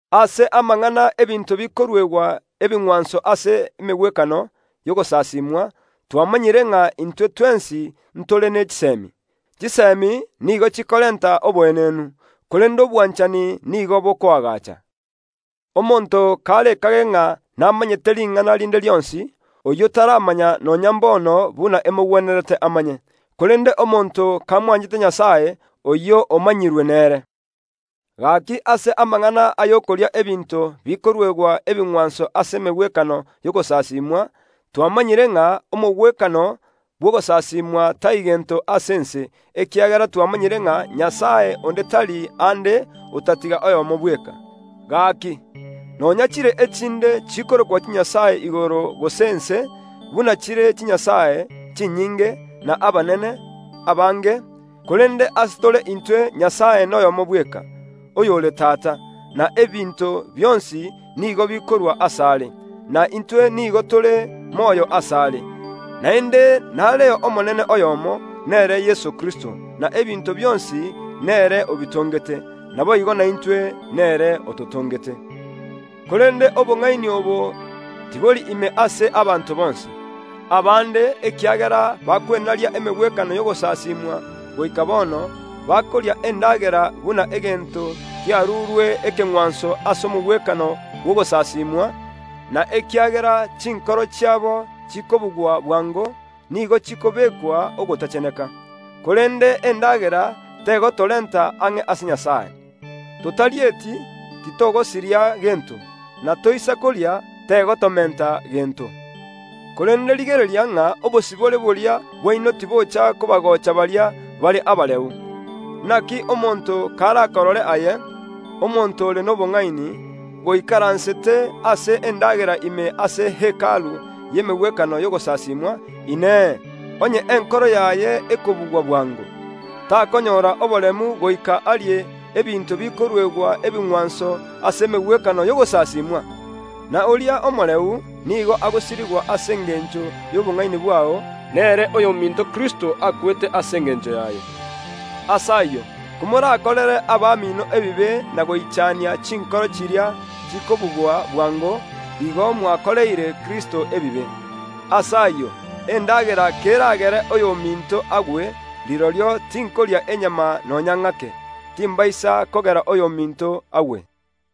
Ase amang’ana ’ebinto bikoruegwa ebing’wanso ase emegwekano y’ogosasimwa, twamanyire ng’a “intwe twensi ntore ne chisemi.” “Chisemi” nigo chikorenta oboenenu, korende obwanchani nigo bokoagacha. Omonto karekage ng’a namanyete ring’ana rinde rionsi, oyio taramanya nonya mbono buna emogwenerete amanye. Korende omonto kamwanchete Nyasae, oyio omanyirwe nere. Gaki ase amang’ana ay’okoria ebinto bikoruegwa ebing’wanso ase emegwekano y’ogosasimwa, twamanyire ng’a “omogwekano bw’ogosasimwa tai gento ase ense”, ekiagera twamanyire ng’a “Nyasae onde tari aande, otatiga oyomo bweka.” Gaki, nonya chire echinde chikorokwa chinyasae igoro gose ense (buna chire “chinyasae” chinyinge, na “abanene” abange) korende ase tore intwe Nyasae noyomo bweka, oyore Tata, na ebinto bionsi nigo bikorwa asare, na intwe nigo tore moyo asare. Naende nare Omonene oyomo, nere Yeso Kristo, na ebinto bionsi nere obitongete, naboigo naintwe nere ototongete. Korende obong’aini obo tibori ime ase abanto bonsi. Abande, ekiagera bakwenaria emegwekano y’ogosasimwa goika bono, bakoria endagera buna egento kiarurwe ekeng’wanso ase omogwekano bw’ogosasiimwa, na ekiagera chinkoro chiabo chikobugwa bwango, nigo chikobekwa ogotacheneka. Korende endagera tegotorenta ang’e ase Nyasae. Totarieti, titogosiria gento, na toisa koria, tegotomenta gento. Korende rigereria ng’a obosibore boria bwaino tibocha kobagocha baria bare abareu. Naki omonto karakorore aye, omonto ore nobong’aini, goikaransete ase endagera ime ase Hekalu y’emegwekano y’ogosasimwa, Inee, onye enkoro yaye ekobugwa bwango, takonyora oboremu goika arie ebinto bikoruegwa ebingwanso ase emegwekano y’ogosasimwa? Ase igo oria omoreu nigo agosirigwa ase engencho y’obong’aini bwao, nere oyominto Kristo akwete ase engencho yaye. Ase ayio, komorakorere abamino ebibe na goichania chinkoro chiria chikobugwa bwango, igo mwakoreire Kristo ebibe. Ase ayio, endagera keragere oyominto agwe, rirorio tinkoria enyama nonya ng’ake, timbaisa kogera oyominto agwe.